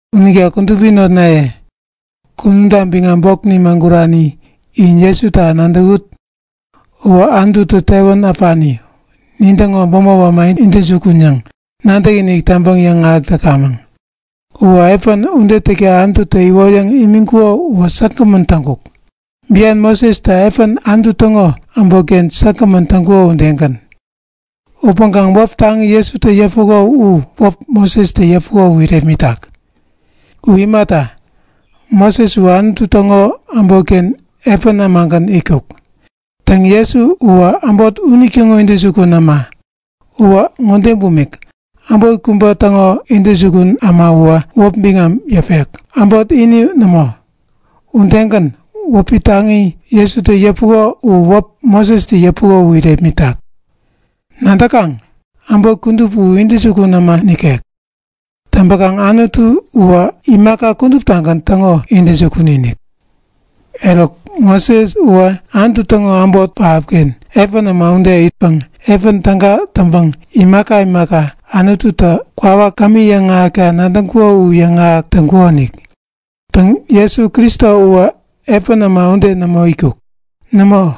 Unita kudupi notnaye, kunumta biŋam bok nimagurani in Jesuta nadäwut! Uwä Anututä tewän äpani, nintäŋo bämop äma intäjukun yäŋ nadäkinik täŋpäŋ yäŋahäk täkamäŋ. U piä ude täkta Anututä iwoyäŋ imiŋkuko uwä säkgämän täŋkuk, bian Mosestä piä Anutu täŋo äbotken säkgämän täŋkuko udegän. Upäŋkaŋ wäp taŋi Jesutä yäpuko u wäp Mosestä yäpuko u irepmitak. U imata, Moses uwä Anutu täŋo äbotken piä ämagän itkuk. Täŋ, Jesu uwä äbot unitäŋo intäjukun äma. Uwä ŋode bumik; Äbot kubä täŋo intäjukun äma uwä wäp biŋam yäpek, äbot ini nämo. Udegän, wäp taŋi Jesutä yäpuko u wäp Mosestä yäpuko u irepmitak. Nadäkaŋ? Äbot kudup u intäjukun äma nikek. Täŋpäkaŋ Anutu uwä imaka kuduptagän täŋo intäjukun-inik. Eruk, Moses uwä Anutu täŋo äbot pähapken piä äma ude itkaŋ piä täga täŋpäŋ imaka imaka Anututä kwawak kämi yäŋahäkta nadäŋkuko u yäŋahäk täŋkukonik. Täŋ, Jesu Kristo uwä piä äma ude nämo itkuk. Nämo,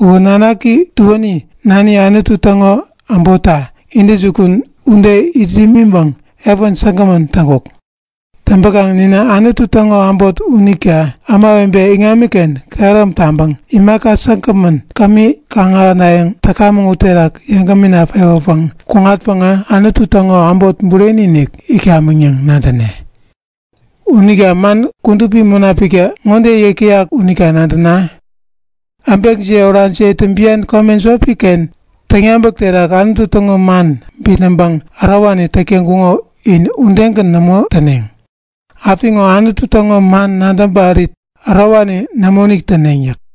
u nanaki tuänitä nani Anutu täŋo äbotta intäjukun ude it yämiŋpäŋ piä säkgämän täŋkuk. Täŋpäkaŋ ninä Anutu täŋo äbot. Unita ämawebe iŋamiken kehärom taŋpäŋ imaka säkgämän kämi kaŋ-ahänayäŋ täkamäŋ uterak yeŋgämina pewäpäŋ kuŋatpäŋä, Anutu täŋo äbot bureni-inik itkamäŋ yäŋ nadäne. Unita man Kudupi Munapiktä ŋode yäk täyak unita nadäna; Äbekjiye orajiyetä bian kome jopi-ken täŋyabäk terak Anutu täŋo man bitnäŋpäŋ ärowani täk täŋkuŋo u in udegän nämo täneŋ. Apiŋo Anutu täŋo man nadäŋ parit ärowani nämoinik täneŋ yäk.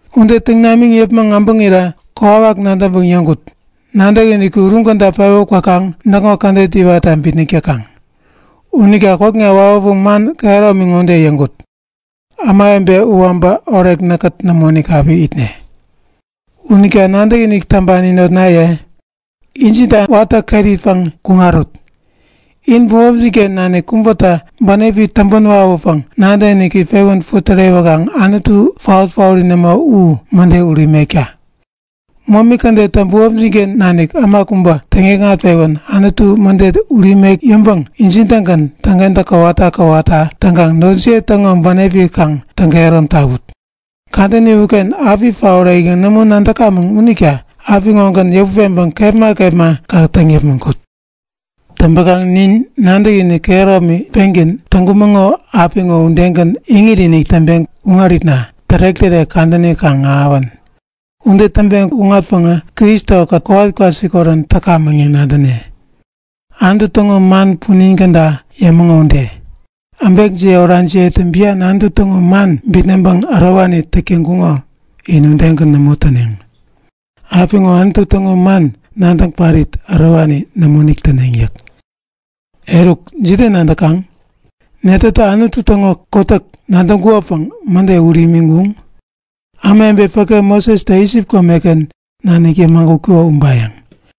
Ude täŋ namiŋ yäpmäŋ äbäŋirä kokwawak nadäŋpäŋ yäŋkut; Nadäkiniki uruŋ käda pewä kwäpäŋ näkŋo kädet iwatta bitnäk täkaŋ. Unita kokna wawäpäŋ man kehäromi ŋode yäŋkut; Ämawebe uwä äbä orek näkkät nämoinik api itne. Unita nadäkinik täŋpani notnaye, injinta watä ket itpäŋ kuŋarut! In bämopjin-ken nanik kubätä bänepi täŋpän wawäpäŋ nadäkiniki pewän putärewäkaŋ Anutu paot-paori nämo, u mäde ut imekta! Momi kädettä bämopjin-ken nanik äma kubä täŋikŋat-pewän Anutu mäde ut imek yäŋpäŋ injin-tägän täŋkentäk kowata kowata täŋkaŋ notjiye täŋo bänepi kaŋ täŋkehärom tawut. Kadäni uken api paorek yäŋ nämo nadäkamäŋ unita apiŋogän yäput peŋpäŋ kepma kepma kaŋ täŋ yäpmäŋ kut. Täŋpäkaŋ nin nadäkinik kehäromi pengän täŋkumäŋo apiŋo udegän iŋit-inik täŋpeŋ kuŋaritna tärek-tärek kadäni kaŋ ahäwän. Ude täŋpeŋ kuŋatpäŋä Kristo-kät kowat kwasikorän täkamäŋ yäŋ nadäne. Anutu täŋo man punin käda yämäŋo ude; Äbekjiye orajiyetä bian Anutu täŋo man bitnäŋpäŋ ärowani täk täŋkuŋo u in udegän nämo täneŋ. Apiŋo Anutu täŋo man nadäŋ parit ärowani nämoinik täneŋ yäk. Eruk jide nadäkaŋ? Netätä Anutu täŋo kotäk nadäŋkuŋopäŋ mäde ut imiŋkuŋ? Ämawebe päke Mosestä Isip komeken nanik yämagutkuko ubayäŋ.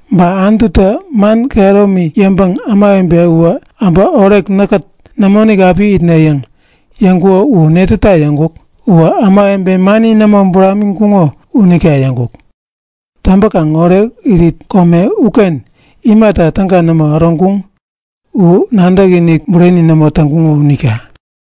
Ba Anututä man kehäromi yäŋpäŋ Anutu Ämawebe uwä äbä orek näkkät nämoinik api itne yäŋ yäŋkuko u netäta yäŋkuk? Uwä ämawebe mani nämo buramiŋkuŋo unita yäŋkuk. Täŋpäkaŋ orekirit kome uken imata täga nämo äroŋkuŋ? U nadäkinik bureni nämo täŋkuŋo unita.